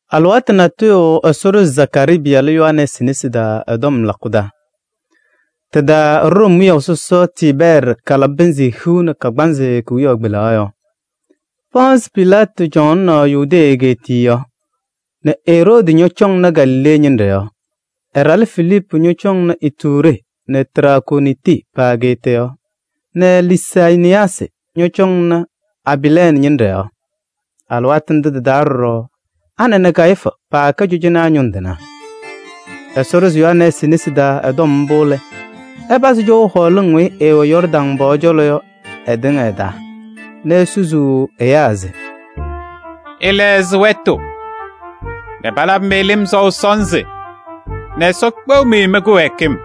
Alɩwaatʋ natʋyʋ Ɛsɔ ɖʋzɩ Zakaarii pɩyalʋ Yohanɛɛsɩ nesi taa ɛ-tɔm lakʋ taa. Tɩ-taa Room wiyaʋ sɔsɔ Tiibɛɛrɩ kalabɩ pɩnzɩ hiu nɛ kagbaanzɩ kewiyaɣ kpelaɣ yɔɔ. Pɔɔnsɩ Pilaatɩ cɔŋaɣnɩ Yudee egeetiye yɔɔ nɛ Eroodi ñɔcɔŋnɩ Galilee ñɩnɖɛ yɔɔ, ɛ-ɖalʋ Filiipu cɔŋaɣnɩ Ituuree nɛ Traakooniti pa-ageeta yɔɔ nɛ Liisaniyaasɩ ñɔcɔŋnɩ Abiilɛɛnɩ ñɩnɖɛ yɔɔ. Alɩwaatʋ ndʋ tɩ-taa ɖɔɖɔ Ana nɛ Kayifu paakɛ cɔjɔnaa ñʋŋ tɩnaa. Ɛsɔ ɖʋzɩ Yohanɛɛsɩ nesi taa ɛ-tɔm mbʋ lɛ, ɛpazɩ cɔʋ hɔɔlɩŋ weyi ɩwɛ Yɔɔrdaŋ pɔɔ cɔlɔ yɔ ɩtɩŋa ɩ-taa nɛ esusuu ɛyaa se: “Ɩlɛɣzɩ wɛtʋ nɛ palabɩ-mɩ lɩm sɔʋ sɔnzɩ nɛ Ɛsɔ kpeɣ-mɩ mɩ-kɩwɛɛkɩm.”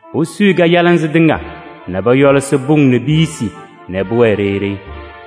Posuyi kajalɩnzɩ tɩŋa nɛ pɔyɔlɩsɩ pʋŋ nɛ piyisi nɛ pʋwɛɛ ɖeyi ɖeyi.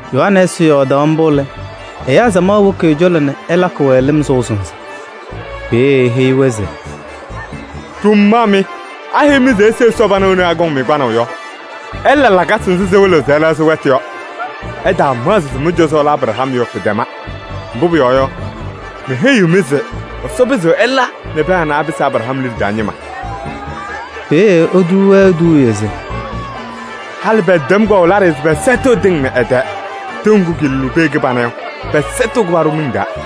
Yohanɛɛsɩ yɔɔdaɣ mbʋ lɛ, ɛyaa samaɣ woki ɛ-cɔlɔ nɛ ɛlakɩ-wɛ lɩm sɔʋ sɔnzɩ. Peeye eheyi-wɛ se: “Ɖʋmaa mɩ! Aheyi-mɩ se ise Ɛsɔ pana wena akɔŋ-mɩ kpanaʋ yɔ? Ɩla lakasɩ nzɩ sɩwɩlɩɣ se ɩlɛɣzɩ wɛtʋ yɔ. Ɩtaamaɣzɩ se mɩ-cɔzɔ lɛ Abraham yɔ, pɩtɛma. Mbʋ pʋyɔɔ yɔ, meheyiɣ-mɩ se Ɛsɔ pɩzɩɣ ɛla nɛ pɛɛ anɛ apɩsɩ Abraham liɖe taa ñɩma.” Peeye etuu-wɛ eduuye se: “Halɩ pɛtɛm kpaɣʋ laɖɩyɛ se pɛsɛtɩɣ tɩŋ nɛ ɩ-tɛɛ: tɩʋ ŋgʋ kɩɩlʋlʋʋ pee kɩbana yɔ, pɛsɛtɩɣ-kʋ nɛ paɖʋ miŋ taa.”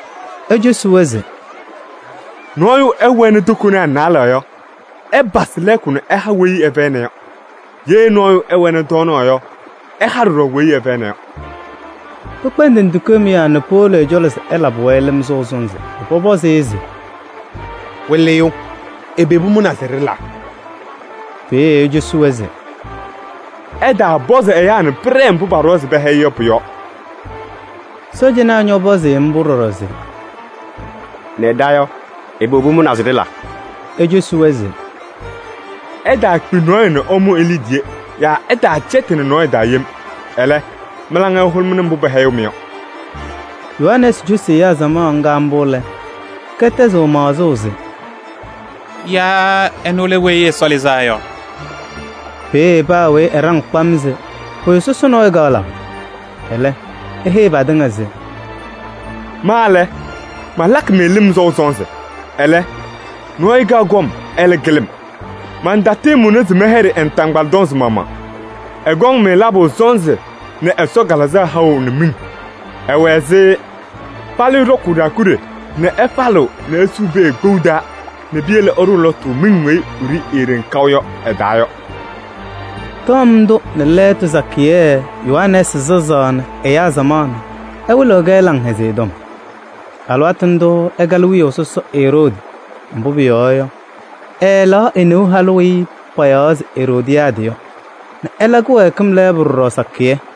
Ecosi-wɛ se: “Nɔɔyʋ ɛwɛnɩ tokonaa naalɛ yɔ, ɛpasɩ lɛɛkʋ nɛ ɛha weyi ɛfɛyɩna yɔ. Ye nɔɔyʋ ɛwɛnɩ tɔɔnaɣ yɔ, ɛha ɖɔɖɔ weyi ɛfɛyɩna yɔ.” Pɩkpɛndɩnɩ tikee mʋyaa nɛ powolo ɛ-cɔlɔ se ɛlabɩ-wɛ lɩm sɔʋ sɔnzɩ nɛ pɔpɔzɩ-ɩ se: “Wɩlɩyʋ, ɛbɛ pʋmʋnaa se ɖɩla?” Peeye ecosi-wɛ se: “Ɩtaapɔzɩ ɛyaa nɛ pɩɖɛɛ mbʋ paɖʋwa se pɛhɛyɩ yɔ pʋ-yɔɔ.” Sɔɔjanaa ñɔpɔzɩ-ɩ mbʋ ɖɔɖɔ se: “Nɛ ɖa yɔ, ɛbɛ pʋmʋnaa se ɖɩla?” Ecosi-wɛ se: “Ɩtaakpi nɔɔyʋ nɛ ɩmʋ e-liidiye yaa ɩtaacɛtɩnɩ nɔɔyʋ taa yem. Ɛlɛ, mɩ-laŋa ɩhʋlʋmɩnɩ mbʋ pɛhɛyɩɣ-mɩ yɔ.” Yohanɛɛsɩ cosi ɛyaa samaɣ ŋga mbʋ lɛ, kɛtɛzɩ maɣzʋʋ se: “Yaa ɛnʋ lɛ Weyi Ɛsɔ Lɩzaa Yɔ?” Peeye paa weyi ɛɖaŋ kpam se pʋyʋ sɔsɔ nɔɔyʋ kɔŋ labʋ. Ɛlɛ, eheyi patɩŋa se: “Ma lɛ, malakɩ-mɩ lɩm sɔʋ sɔnzɩ. Ɛlɛ, nɔɔyʋ kaɣ kɔm, ɛlɛ kɩlɩ-m. Mantatɩɩmʋnɩ se mɛyɛɖɩ ɛ-naataŋgbala tɔnzɩ maɣmaɣ. Ɛkɔŋ-mɩ labʋ sɔnzɩ nɛ Ɛsɔ Kalɩzaɣ haʋ nɛ miŋ. Ɛwɛ ɛzɩ falɩyʋ ɖɔkʋʋ ɖaakuɖe nɛ ɛfalɩɣ nɛ esuu pee kpou taa nɛ piyele ɛɖʋʋ lɔtʋ miŋ weyi eeɖeŋ wiɖiyi kaʋ yɔ ɛ-taa yɔ.” Tɔm ndʋ nɛ lɛɛtʋ sakɩyɛ Yohanɛɛsɩ sazaɣnɩ ɛyaa samaɣ nɛ ɛwɩlɩɣ-kɛ Laŋhɛzɩyɛ Tɔm. Alɩwaatʋ ndʋʋ ɛkalɩ wiyaʋ sɔsɔ Eroodi, mbʋ pʋyɔɔ yɔ, ɛɛlɛɣ e-neu halʋ weyi payaɣ se Eroodiyaadɩ yɔ nɛ ɛla kɩwɛɛkɩm lɛɛbʋ ɖɔɖɔ sakɩyɛ.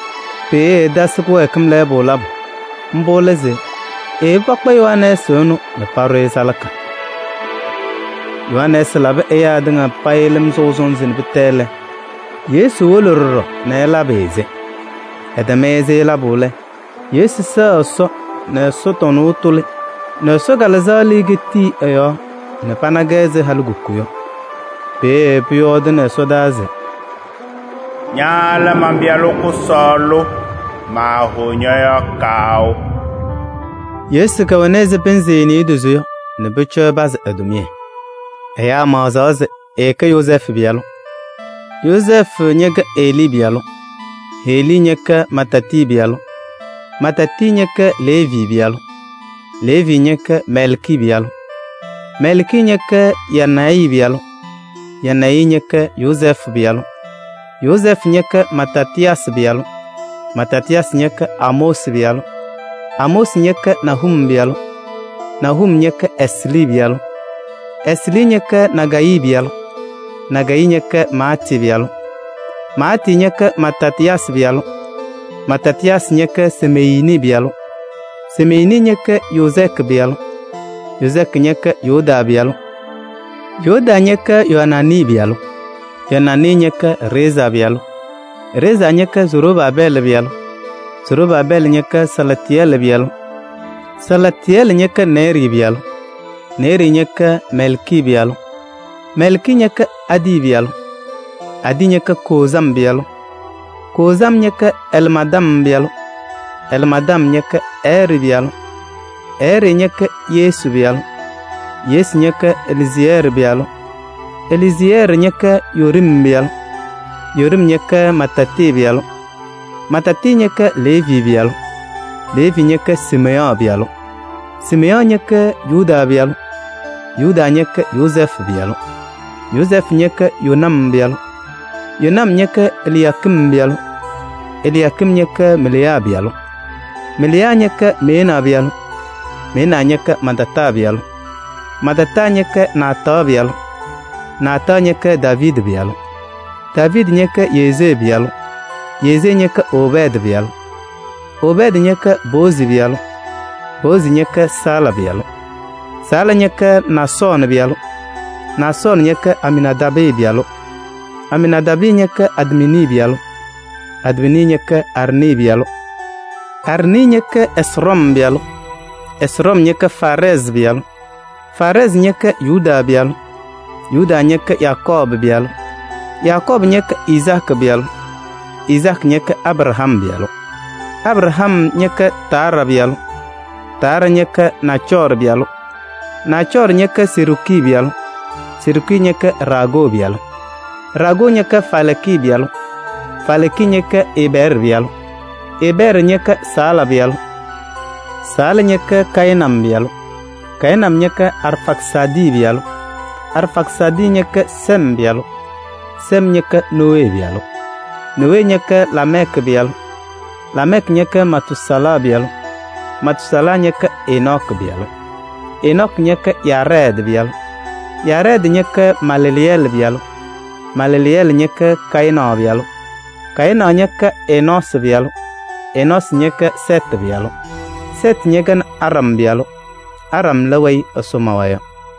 Peeye ɛtasɩ kɩwɛɛkɩm lɛɛbʋ labʋ. Mbʋ lɛ se eyebi pakpa Yohanɛɛsɩ ɛnʋ nɛ paɖʋ-ɩ salaka. Yohanɛɛsɩ labɩ ɛyaa tɩŋa payɩ lɩm sɔʋ sɔnzɩ nɛ pɩtɛ lɛ, Yesu wolo ɖɔɖɔ nɛ ɛlabɩ-ɩ-sɩ. Ɛtɛm-ɩ-sɩ labʋ lɛ, Yesu sɛɣ Ɛsɔ nɛ ɛsɔtɔnʋʋ tʋlɩ nɛ Ɛsɔ Kalɩzaɣ lɩɩ ketiki ɛ-yɔɔ nɛ panaɣ-kɛ ɛzɩ halikuku yɔ. Peeye pʋyɔɔdʋʋnɩ ɛsɔdaa se: “Ña lɛ man-Pɩyalʋ kʋsɔɔlʋ, maahʋʋ ñɔ-yɔɔ kaʋ.” Yesu kɛwɛnɩ ɛzɩ pɩnzɩ niidozo yɔ nɛ pʋcɔ ɛpazɩ ɛ-tʋmɩyɛ. Ɛyaa maɣzaɣ se ɛkɛ Yozɛɛfʋ pɩyalʋ. Yozɛɛfʋ ñɛkɛ Helii pɩyalʋ, Helii ñɛkɛ Mataatɩ pɩyalʋ, Mataatɩ ñɛkɛ Leevi pɩyalʋ, Leevi ñɛkɛ Mɛlkii pɩyalʋ, Mɛlkii ñɛkɛ Yanayi pɩyalʋ, Yanayi ñɛkɛ Yozɛɛfʋ pɩyalʋ, Yozɛɛfʋ ñɛkɛ Matatɩyaasɩ pɩyalʋ, Matatɩyaasɩ ñɛkɛ Amoosi pɩyalʋ, Amoosi ñɛkɛ Nahum pɩyalʋ, Nahum ñɛkɛ Eslii pɩyalʋ, Eslii ñɛkɛ Nagayii pɩyalʋ, Nagayii ñɛkɛ Maatɩ pɩyalʋ, Maatɩ ñɛkɛ Matatɩyaasɩ pɩyalʋ, Matatɩyaasɩ ñɛkɛ Semeyiini pɩyalʋ, Semeyiini ñɛkɛ Yozɛɛkɩ pɩyalʋ, Yozɛɛkɩ ñɛkɛ Yodaa pɩyalʋ, Yodaa ñɛkɛ Yoaanaanɩ pɩyalʋ, Yoaanaanɩ ñɛkɛ Reezaa pɩyalʋ, Reezaa ñɛkɛ Zorobaabɛɛlɩ pɩyalʋ, Zorobaabɛɛlɩ ñɛkɛ Salaatɩyɛlɩ pɩyalʋ, Salaatɩyɛlɩ ñɛkɛ Neerii pɩyalʋ, Neerii ñɛkɛ Mɛlkii pɩyalʋ, Mɛlkii ñɛkɛ Adii pɩyalʋ, Adii ñɛkɛ Koozam pɩyalʋ, Koozam ñɛkɛ Ɛlmaadam pɩyalʋ, Ɛlmaadam ñɛkɛ Ɛɛrɩ pɩyalʋ, Ɛɛrɩ ñɛkɛ Yesu pɩyalʋ, Yesu ñɛkɛ Eliyeezɛɛrɩ pɩyalʋ, Eliyeezɛɛrɩ ñɛkɛ Yoorim pɩyalʋ, Yoorim ñɛkɛ Mataatɩ pɩyalʋ, Mataatɩ ñɛkɛ Leevi pɩyalʋ, Leevi ñɛkɛ Siimeyɔɔ pɩyalʋ, Siimeyɔɔ ñɛkɛ Yuda pɩyalʋ, Yuda ñɛkɛ Yozɛɛfʋ pɩyalʋ, Yozɛɛfʋ ñɛkɛ Yonam pɩyalʋ, Yonam ñɛkɛ Eliyaakim pɩyalʋ, Eliyaakim ñɛkɛ Meleya pɩyalʋ, Meleya ñɛkɛ Mɛnaa pɩyalʋ, Mɛnaa ñɛkɛ Matataa pɩyalʋ, Matataa ñɛkɛ Naataɣ pɩyalʋ, Naataɣ ñɛkɛ Daaviidi pɩyalʋ, Daaviidi ñɛkɛ Yesee pɩyalʋ, Yesee ñɛkɛ Obɛɛdɩ pɩyalʋ, Obɛɛdɩ ñɛkɛ Boozi pɩyalʋ, Boozi ñɛkɛ Sala pɩyalʋ, Sala ñɛkɛ Naasɔɔnɩ pɩyalʋ, Naasɔɔnɩ ñɛkɛ Aminaadaabɩ pɩyalʋ, Aminaadaabɩ ñɛkɛ Admini pɩyalʋ, Admini ñɛkɛ Arnii pɩyalʋ, Arnii ñɛkɛ Ɛsrɔm pɩyalʋ, Ɛsrɔm ñɛkɛ Faarɛɛzɩ pɩyalʋ, Faarɛɛzɩ ñɛkɛ Yuda pɩyalʋ, Yuda ñɛkɛ Yakɔɔbʋ pɩyalʋ, Yakɔɔbʋ ñɛkɛ Izaakɩ pɩyalʋ, Izaakɩ ñɛkɛ Abraham pɩyalʋ, Abraham ñɛkɛ Taaraa pɩyalʋ, Taaraa ñɛkɛ Naacɔɔrɩ pɩyalʋ, Naacɔɔrɩ ñɛkɛ Seruuki pɩyalʋ, Seruuki ñɛkɛ Raagoo pɩyalʋ, Raagoo ñɛkɛ Faalɛɛkɩ pɩyalʋ, Faalɛɛkɩ ñɛkɛ Eebɛɛrɩ pɩyalʋ, Eebɛɛrɩ ñɛkɛ Sala pɩyalʋ, Sala ñɛkɛ Kayɩnam pɩyalʋ, Kayɩnam ñɛkɛ Arfaksaadɩ pɩyalʋ, Arfaksaadɩ ñɛkɛ Sem pɩyalʋ, Sem ñɛkɛ Nowee pɩyalʋ, Nowee ñɛkɛ Laamɛɛkɩ pɩyalʋ, Laamɛɛkɩ ñɛkɛ Matuusalaa pɩyalʋ, Matuusalaa ñɛkɛ Enɔɔkɩ pɩyalʋ, Enɔɔkɩ ñɛkɛ Yaarɛɛdɩ pɩyalʋ, Yaarɛɛdɩ ñɛkɛ Maleleyɛɛlɩ pɩyalʋ, Maleleyɛɛlɩ ñɛkɛ Kayɩnaɣ pɩyalʋ, Kayɩnaɣ ñɛkɛ Enɔɔsɩ pɩyalʋ, Enɔɔsɩ ñɛkɛ Sɛɛtɩ pɩyalʋ, Sɛɛtɩ ñɛkɛ Aɖam pɩyalʋ nɛ Aɖam lɛ weyi Ɛsɔ mawa yɔ.